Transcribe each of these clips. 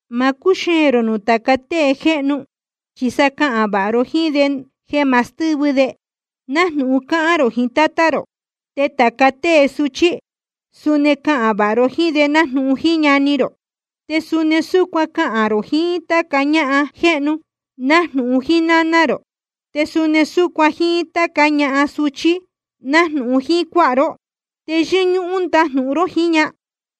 Ma cúxeēn rō nuū tāca tée jéhnu, chi sa cahān vāha ró jíín de jeē ma stɨ́vɨ de, nájnūhun cáhán rō jiín tátá rō. Te tāca tée suchí, suni cahān vāha ró jíín de nájnūhun jíín ñani rō. Te suni súcuan cahān rō jiín táca ñahan jéhnu, nájnūhun jíín náná rō. Te suni súcuan jíín táca ñahan súchí, nájnūhun jíín cuáha ró, te yɨ́ñúhún ndajnūhun ró jiín ña.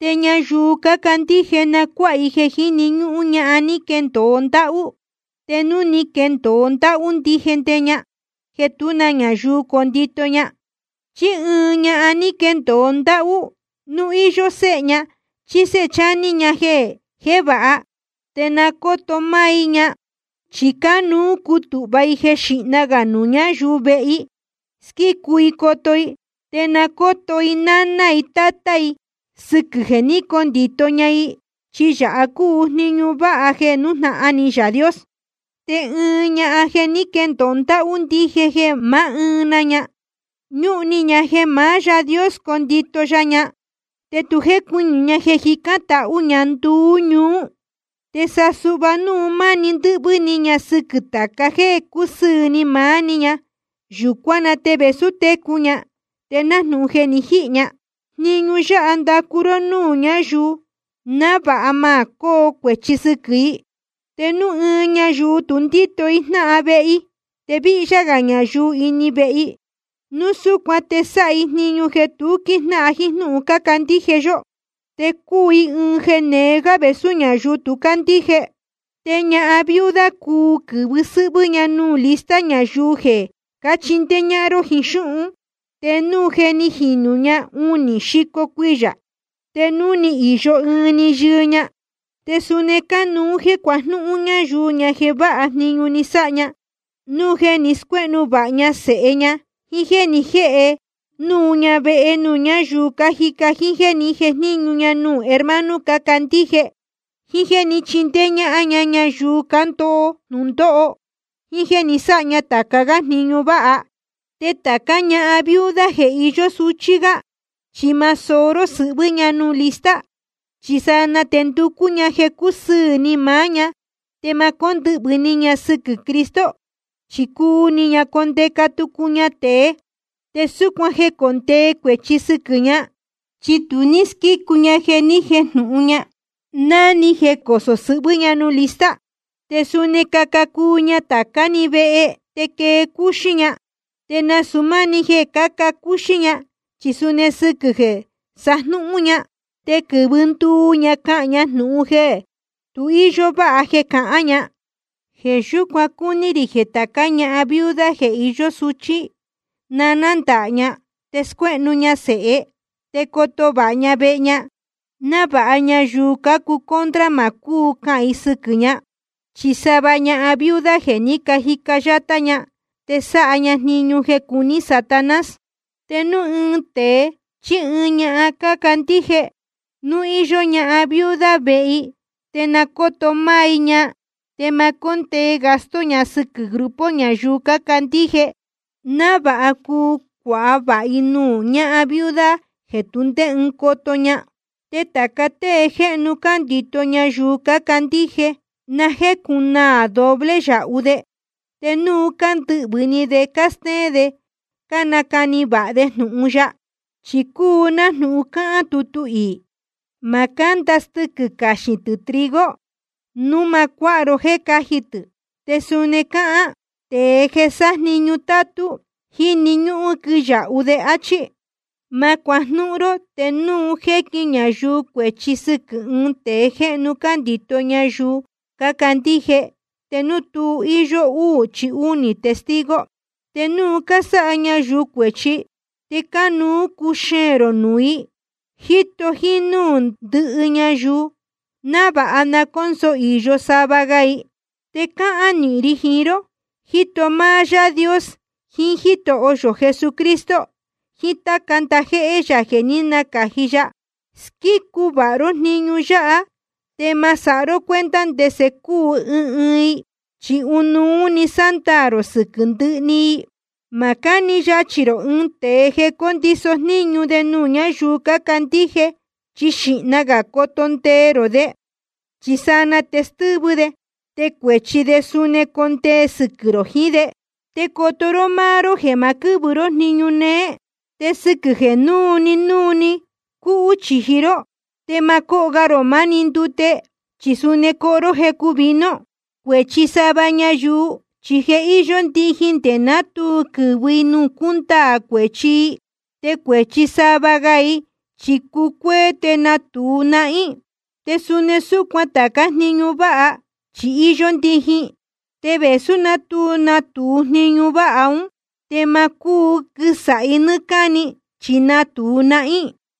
Te ñayuu cácandíje na cuáha i jeē jíni ñúhún ñahan ni caquendōo ndáhú, te núu ni quendōo ndáhú ndije ña jeē tú na ñayuu condito ña. Chi ɨɨn ñahan ní quendōo ndáhú, núu íyó séhe ña chí séhe chání ña jeē jévāha, te na cóto máá i ña. Chi cánuú cutūhva i jeē xíhna gā nuū ñáyuu vehe i squícu i coto i. Te na nácoto i náná i tátá i sɨquɨ̄ jeē ní cacondito ña i. Chi yāha cúu jniñu váha jeē nújnahan ni Yaā Dios. Te ɨɨn ñahan ní quendōo ndáhú ndije jeē máá ɨɨn na ña, ñúhun ni ña jeē maá Yaā Dios condito ya ña, te tu jécuɨñɨ̄ ña jeē jicán tahú ña nduú ñuú. Te sa suhva núu máni ndɨ́hvɨ́ ni ña sɨquɨ̄ tāca jéē cúsɨɨ̄ ni maá‑ni ña, yūcuán na te vēsú técu ña, te nájnūhun je ni jihī ña. Jniñu yáha ndacu ró núū ñáyuu, návāha ma cóo cuēchi sɨquɨ̄ i. Te núu ɨɨn ñayuu tu ndíto i jnáhan vehe i, te víhyá gā ñayuu ini vehe i, núu súcuan te sáha i jniñu jeē tu quíjnáhan jíín jnúhun cándíje yó, te cúu i ɨɨn jeē neé gá vēsú ñáyuu tu cácandíje. Te ñahan viuda cuu quɨ̄vɨ sɨ́hvɨ́ ña nuū lista ñayuu jeē cáchindéé ñáhán ró jiín xúhun, te núu je ni jīnu ña unī xico cuiyā, te núu ni īyo ɨɨn‑ni yɨɨ ña. Te suni cánuú jéē cuajnúhún ñáyuu ña jeē váha jniñu ni sáha ña, núu jeē ni scuéhnu vāha ña sēhe ña, jíín jéē ní jēhe núu ña vehe nuū ñáyuu cájica, jíín jéē ní jejníñu ña nuū hermano cácandíje, jíín jéē ní chindéé ñáhán ña ñayuu cándoho jnūndóho, jíín jéē ni sáha ña tāca gá jniñu váha. Te tācá ñahan viuda jeē iyó suchí gá, chi ma soó ró sɨhvɨ́ ña nuū lista. Chi sanaa te nducú ña jeē cúsɨɨ̄ ni maá‑ni ña, te ma cóndɨhvɨ̄ ni ña sɨquɨ̄ Cristo, chi cuu ni ña condeca tucu ña tēe. Te súcuan jecondee cuēchi sɨquɨ̄ ña, chi tu ní squícu ña jeē ni jéjnūhun ña ná ni jecosō sɨhvɨ́ ña nuū lista. Te suni caca cuu ña tācá‑ni vehe te quee cúxí ña. Te nasūu máni jeē cáca cúxí ña, chi suni sɨquɨ̄ jeē sajnúhún ña, te quɨ̄vɨ nduu ña cahān ña jnūhun jeē tu íyó váha jeē cahán ña. Jeē yúcuan cúní rī jeē tācá ñahan viuda jeē iyó suchí, na nándāha ña, te scuéhnu ña sēhe, te coto vāha ña vehe ña, návāha ñayuu cácuu contra ma cúu cahān i sɨquɨ̄ ña. Chi sava ñahan viuda je ni cajica yátá ña te sáha ña jniñu jeē cuní Satanás. Te núu ɨɨn tēe chí ɨɨn ñahan cándíje, núu íyó ñahan viuda vehe i, te na cóto máá i ña. Te ma cóndee gasto ña sɨquɨ̄ grupo ñayuu cácandíje, návāha cuu cuāha vāha i nuū ñahan viuda jeē tu ndé ɨɨn coto ña. Te tāca tée jéhnu cándito ñayuu cácandíje, na jécunaā doble yāhu de, te núu cándɨhvɨ̄ ni de cástéén de cánacani vāha de jnūhun ya. Chi cúu nájnūhun cáhán tutu iī: Ma cánda stɨquɨ̄ caxīn tɨ̄ trigo, núu ma cuáha ró jéē cáji tɨ̄. Te suni cáhán: Tēe jeē sájniñu tátú, jíni ñúhún quɨyāhu de, áchí. Ma cuajnúhún ró te núu jéquin ñayuu cuēchi sɨquɨ̄ ɨɨn tēe jéhnu cándito ñayuu cácandíje te núu tu íyó úū chí únī testigo. Te núu cásáha ñayuu cuēchi, te cánuú cuxeēn rō nuū i, jíto jínúū ndɨhɨ ñayuu, návāha na cónso īyo sava ga i. Te cáhán nīhin ri jiín ró, jíto máá Yaā Dios jiín Jítoho yō Jesucristo jiín táca ndajéhé yā jeē ní nacāji ya: Squícu vāha ró jniñu yáha, te ma sáha ró cuenta ndese cúu ɨɨn ɨɨn i, chi ɨnuú‑ni sándaā rō sɨquɨ̄ ndɨhɨ‑ni i. Ma cáni yachī rō ɨɨn tēe jeē condiso jníñu de nuū ñáyuu cácandíje, chi xīhna gā coto ndee rō de. Chi sanaa te stɨ́vɨ de, te cuēchi de suni condee sɨquɨ̄ rō jiín de. Te coto ró máá ró jeē ma quɨ́vɨ ró jíín jniñu néé. Te sɨquɨ̄ jeē núu‑ni núu‑ni cúhú chīji ró, te ma cóho ga rō máni ndute, chi suni coho ró jecu vino. Cuēchi sava ñayuu chi je íyó ndijin nde ná tu quɨ̄vɨ i nuū cúndaā cuēchi i. Te cuēchi sava ga i chi cúcuéé te natūu nahín. Te suni súcuan tācá jniñu váha, chi íyó ndijin. Te vēsú ná tu natūu jniñu váha ún, te ma cúu quɨsāhi nɨ́ɨ́ cáni, chi natūu nahín.